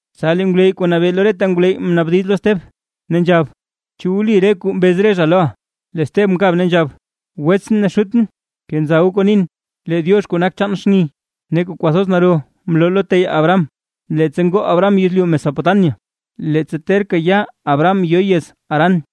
Tsa lee ngwleyy kuu nabee lo reta ngwleyy mnaabdiz lo steb, ne nzhab: ―¿Chu wli re kuu mbez re zha loʼa? Lee Steb mkab ne nzhab: ―Wetsʼn ne xutʼn, kenza goo kuu nin, lee Diox kuu nak chaan xni ne kuu kwathoz naro mloo lo teyaa Abraham, leettsa ngoo Abraham yezlyu Mesopotamia, leettsa terka ya Abraham yo yez Harán.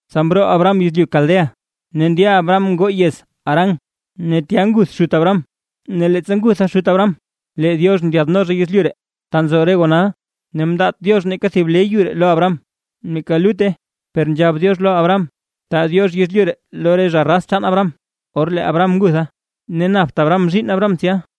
Tsa mroo Abraham yezlyu Caldea ne ndya Abraham ngoo yez Harán. Ne tya nguth xut Abraham ne leettsa ngutha xut Abraham, lee Diox ndyaadno zha yezlyu ree, ta nzo re goo nal. Ne mndaat Diox neeka thib le yu ree lo Abraham, neeka lutte, per nzhab Diox lo Abraham, taa Diox yezlyu ree lo re raz chaan Abraham, or lee Abraham ngutha. Ne napt Abraham zhiinn Abraham tsya.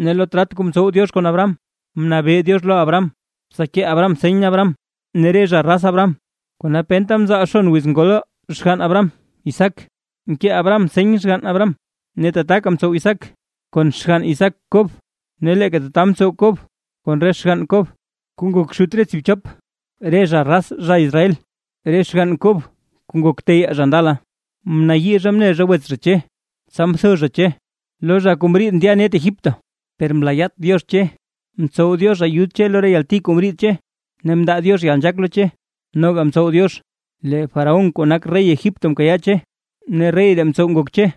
Ne lo trat kuu mtsow Diox kon Abraham, mnabee Diox lo Abraham, tsa kee Abraham seny Abraham ne re zha raz Abraham. Kona penta mzaal xon wiz ngol xgann Abraham Isaac, mkee Abraham seny xgann Abraham, ne tataka mtsow Isaac kon xgann Isaac Kob; ne leeka tata mtsow Kob kon re xgann Kob, kuu ngok xut re tsiibchop re zha raz zha Israel. ’Re xgann Kob kuu ngok re teyaa zha ndala, mnayii zha mne zha wets zha Che, tsa mtho zha Che lo zha kuu mriid ndya net Egipto, per mlaayaat Diox Che, mtsow Diox ayud Che lo re yalti kuu mriid Che, ne mndaa Diox yalnzhaak lo Che, noga mtsow Diox lee faraón zha kuu nak rey Egipto mkayaa Che. Ne rey ree mtsow ngok Che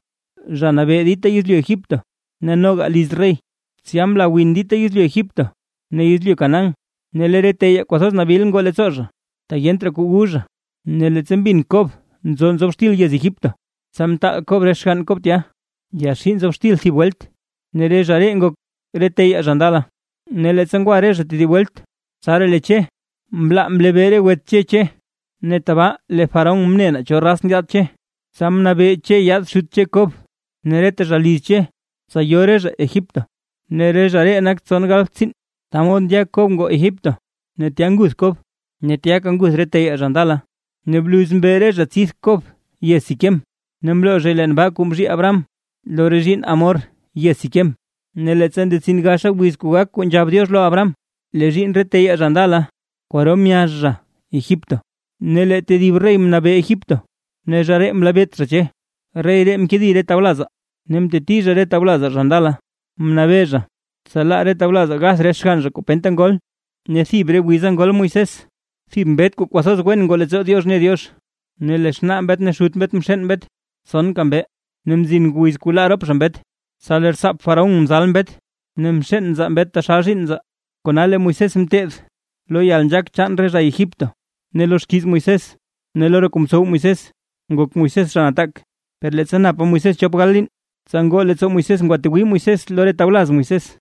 zha nabee dita yezlyu Egipto ne noga liz rey. ’Tsya mla win dita yezlyu Egipto ne yezlyu Canaán, ne lee re teyaa kwathoz nabil ngoo leettsoo zha, tak yent raa kuu wu zha. Ne leettsa mbin Kob nzo nzob xtil yez Egipto; tsa mtaal Kob re xgann Kob tya, yaxii nzob xtil thib welt, ne re zha ree ngok re teyaa zha ndala. Ne leettsa ngwa re zha tedib welt, tsaraa lee Che mlaa mlebee re wets Che Che, ne tabaa lee faraón mne naa cho raz ndyaad Che. Tsa mnabee Che yaad xut Che Kob ne reta zha liz Che, tsa yo re zha Egipto, ne re zha ree nak tson gal tsiin. Ta mod ndya Kob ngoo Egipto; ne tya nguth Kob, ne tyaka nguth re teyaa zha ndala. Ne bluz mbe re zha tsidth Kob yez Siquem, ne mloo zhay leen baa kuu mzhii Abraham lo re zhiinn Hamor yez Siquem. ’Ne leettsa ndetsin gaxa wiz kuu gak kuu nzhab Diox lo Abraham, lee zhiinn re teyaa zha ndala kwaro myazh zha Egipto. Ne lee tedib rey mnabee Egipto, ne zha ree mlebeet zha Che. rey ree mkedi re tawlazaa ne mteti zha re tawlazaa zha ndala. Mnabee zha, tsa laa re tawlazaa gath re xgann zha kuu penta ngol. Ne thib re wiza ngol Moisés, thib mbet kuu kwathoz wen ngoo leettsoo Diox mne Diox, ne lee xnaa mbet ne xut mbet mxeen mbet tsonka mbee. Ne mzin wiz kuu laa rop zha mbet, tsa lee rtsaap faraón mzal mbet ne mxeen nzaa mbet taxal zhiinn nzaa. Kona lee Moisés mteed lo yalnzhaak chaan re zha Egipto, ne lo xkiiz Moisés ne lo re kuu mtsow Moisés ngok Moisés zha nataak. ’Per leettsa napa Moisés chop gal liin, tsa ngoo leettsoo Moisés ngwatwii Moisés lo re tawlaz Moisés,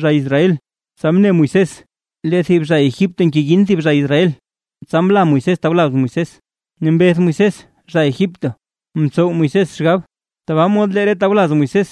zha Israel. Tsa mne Moisés lee thib zha Egipto ngeyin thib zha Israel, tsa mla Moisés tawlaz Moisés, ne mbeth Moisés zha Egipto. Mtsow Moisés xgab tabaa mod lee re tawlaz Moisés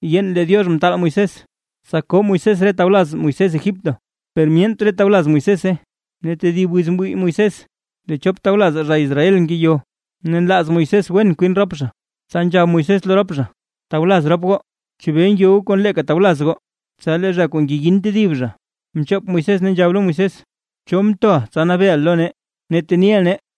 yeen lee Diox mtaal Moisés, tsa koo Moisés re tawlaz Moisés Egipto; per myent re tawlaz Moisése. Ne tedib wiz mwii Moisés lee chop tawlazaa zha Israel ngeyo ne nlaaz Moisés wen kwin rop zha, tsa nzhab Moisés lo rop zha: “Tawlaz rop goo; ¿Chebee ngyo goo kon leeka tawlaz goo?” Tsa lee zha kuu ngeyin tedib zha mchop Moisés ne nzhab lo Moisés: “¿Cho mtoʼa tsa nabeeʼa lo nee, ne teniʼa nee?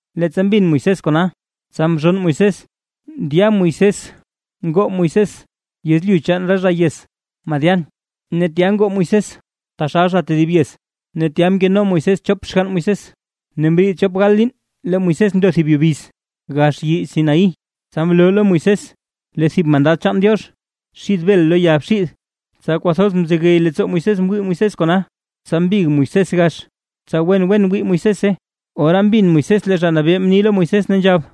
Leettsa mbin Moisés kona, tsa mzhonn Moisés ndya Moisés ngoo Moisés yezlyu chaan re zha yez Madián, ne tya ngoo Moisés taxal zha tedib yez ne tya mkeno Moisés chop xgann Moisés. ’Ne mriid chop gal liin lee Moisés ndo thib yubiz, gax yii Sinaí, tsa mloo thib mandad chaan Diox xid bel lo ya bxiid lo Moisés. Tsa kwathoz mzegey leettsoo Moisés mwii Moisés kona, tsa mbig Moisés gax tsa wen wen wii Moisése. Ora mbin Moisés lee Zha Nabee mni lo Moisés, ne nzhab: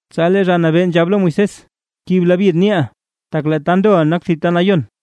Tsa lee Zha Nabee nzhab lo Moisés: “Kib labyid niiʼa, tak lee ta ndoʼa, nak thib ta nayon.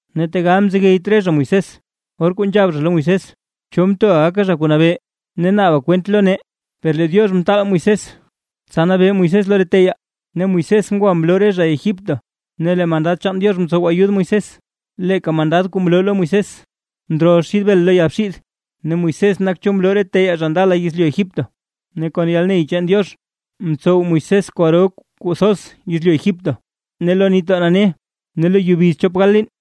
’Ne tegal mzegeyt re zha Moisés, or kuu nzhab zha lo Moisés: “¿Cho mtoʼa gaka zha kuu nabee ne naaba kwent lo nee?” Per lee Diox mtaal Moisés, tsa nabee Moisés lo re teyaa, ne Moisés ngwa mloo re zha Egipto, ne lee mandad chaan Diox mtsow ayud Moisés, leeka mandad kuu mloo lo Moisés ndrol xid bel lo ya bxiid. Ne Moisés nak cho mloo re teyaa zha ndala yezlyu Egipto, ne kon yalney chaan Diox mtsow Moisés kwaro kuu thoz yezlyu Egipto ne lo Nitdoo Nane ne lo yubiz thib chop gal liin.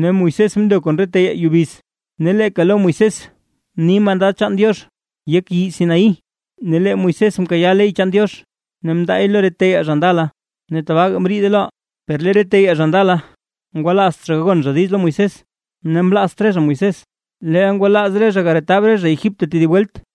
Ne Moisés mndo kon re teyaa yubiz, ne leeka lo Moisés mni mandad chaan Diox yek yii Sinaí, ne lee Moisés mkayaa ley chaan Diox ne mndaay lo re teyaa zha ndala ne tabaaga mriide loʼaa. ’Per lee re teyaa zha ndala, ngwalaazt zha gagon zha diiz lo Moisés, ne mlaazt re zha Moisés, leel ngwalaaz re zha garetab zha Egipto tedib welt.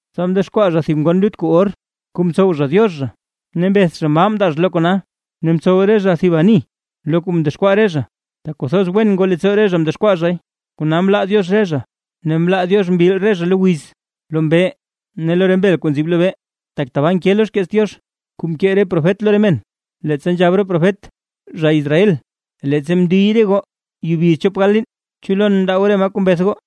Tsa mdexkwaa zha thib ngon lut kuu or, kuu mtsow zha diox zha, ne mbeth zha maa mndaa zha lo kona, ne mtsow re zha thib ani lo kuu mdexkwaa re zha, tak kwathoz wen ngoo leettsoo re zha mdexkwaa zhay. Kona mlaa Diox re zha, ne mlaa Diox mbil re zha lo wiz, lo mbee ne lo re mbel kuu nzib lobee. Tak tabaa nke lo xkeets Diox, kuu mkee re profet lo re men, leettsa nzhab profet: Zha Israel, leettsa mndiy re goo yubiz chop gal liin, ¿chu lon mndaa goo re maa kuu mbeth goo?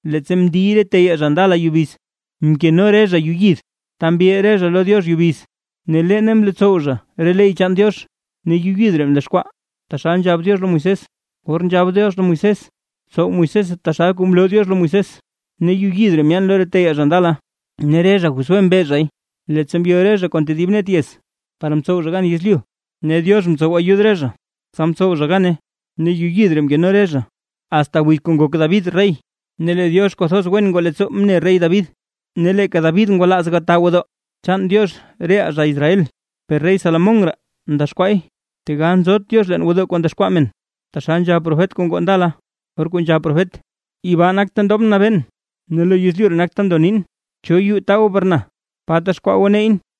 ’Leettsa mndiy re teyaa zha ndala yubiz, mkeno re zha yuu yid, ta mbil re zha lo Diox yubiz, ne leene mlotsow zha re ley chaan Diox. Ne yuu yid ree mdexkwaa taxal nzhab Diox lo Moisés. Or nzhab Diox lo Moisés tsow Moisése taxal kuu mloo Diox lo Moisés. Ne yuu yid ree myaan lo re teyaa zha ndala, ne re zha Josué mbe zhay, leettsa mbyo re zha kon tedib net yez, par mtsow zha gan yezlyu, ne Diox mtsow ayud re zha tsa mtsow zha gane, ne yuu yid ree mkeno re zha, asta wiz kuu ngok David rey. Ne lee Diox kwathoz wen ngoo leettsoo mne rey David, ne leeka David ngwalaaz gataa gwodoo chaan Diox reʼaa zha Israel. Per rey Salomón raa mdexkwaay. Tegal nzot Diox leen gwodoo kuu ndexkwaa men, taxal nzhab profet kuu ngoo ndala, or kuu nzhab profet: Yibaa nak ta ndobʼn nabeen, ne lo yezlyu nak ta ndo nin. ¿Cho yuu taa goo par na? ¿Pa texkwaa goo neyʼn?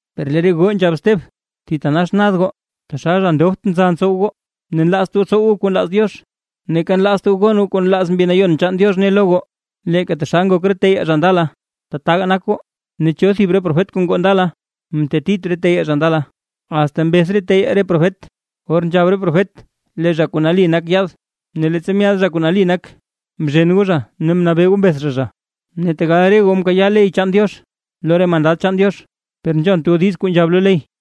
Per lee re goo nzhab Steb: ―Thitanax nad goo, taxal zha ndobt nza ntsow goo, ne nlaazt goo tsow goo kuu nlaaz Diox, neeka nlaazt goo gon goo kuu nlaaz Mbi Nayon chaan Diox ne lo goo, leeka taxal ngok re teyaa zha ndala taga nak goo. ¿Ne cho thib re profet kuu ngoo ndala, mtetit re teyaa zha ndala? Asta mbeth re teyaa re profet, or nzhab profet lee Zha Kuu Nali Nak Yaad, ne leettsa myaad Zha Kuu Nali Nak, mzhen goo zha ne mnabee goo mbeth zha, zha. Ne tegal re goo mkayaa ley chaan Diox lo re mandad chaan Diox, per nzhont goo diiz kuu nzhab lo ley.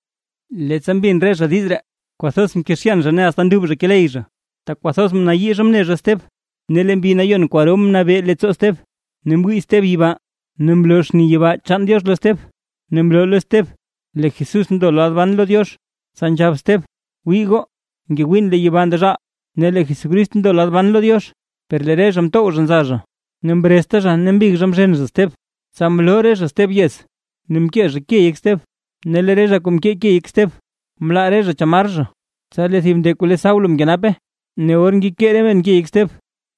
Leettsa mbin re zha diiz ree, kwathoz mkezhyan zha ne asta nduub zha keley zha, tak kwathoz mnayii zha mne zha Steb. Ne lee Mbi Nayon kwaro nabee leettsoo Steb, ne mwii Steb yibaa ne mloo xni yibaa chaan Diox lo Steb, ne mloo lo Steb lee Jesús ndo lad ban lo Diox. Tsa nzhab Steb: ―¡Wii goo! Ngewiin lee yibaa ndezhaal, ne lee Jesucrist ndo lad ban lo Diox. Per lee re zha mtow zha nza zha, ne mrezta zha ne mbig zha mzhen zha Steb. Tsa mloo re zha Steb yez ne mkee zha ke yek Steb, ne lee re zha kuu mkee ke yek Steb, mlaa re zha chamar zha, tsa lee thib nde kuu le Saulo mkenape. Ne or ngekee re men ke yek Steb,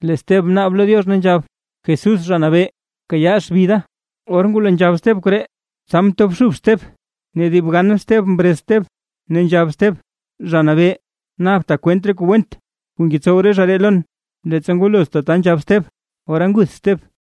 lee Steb mnaab lo Diox ne nzhab: ―Jesús Zha Nabee, bkayaa xbi da. Or ngwalo nzhab Steb koree, tsa mtobxub Steb ne dib gan Steb mrez Steb, ne nzhab Steb: ―¡Zha Nabee, naabta kwent re kuu went kuu ngetsow re zha ree lon! Leettsa ngwalo tata nzhab Steb, ora nguth Steb.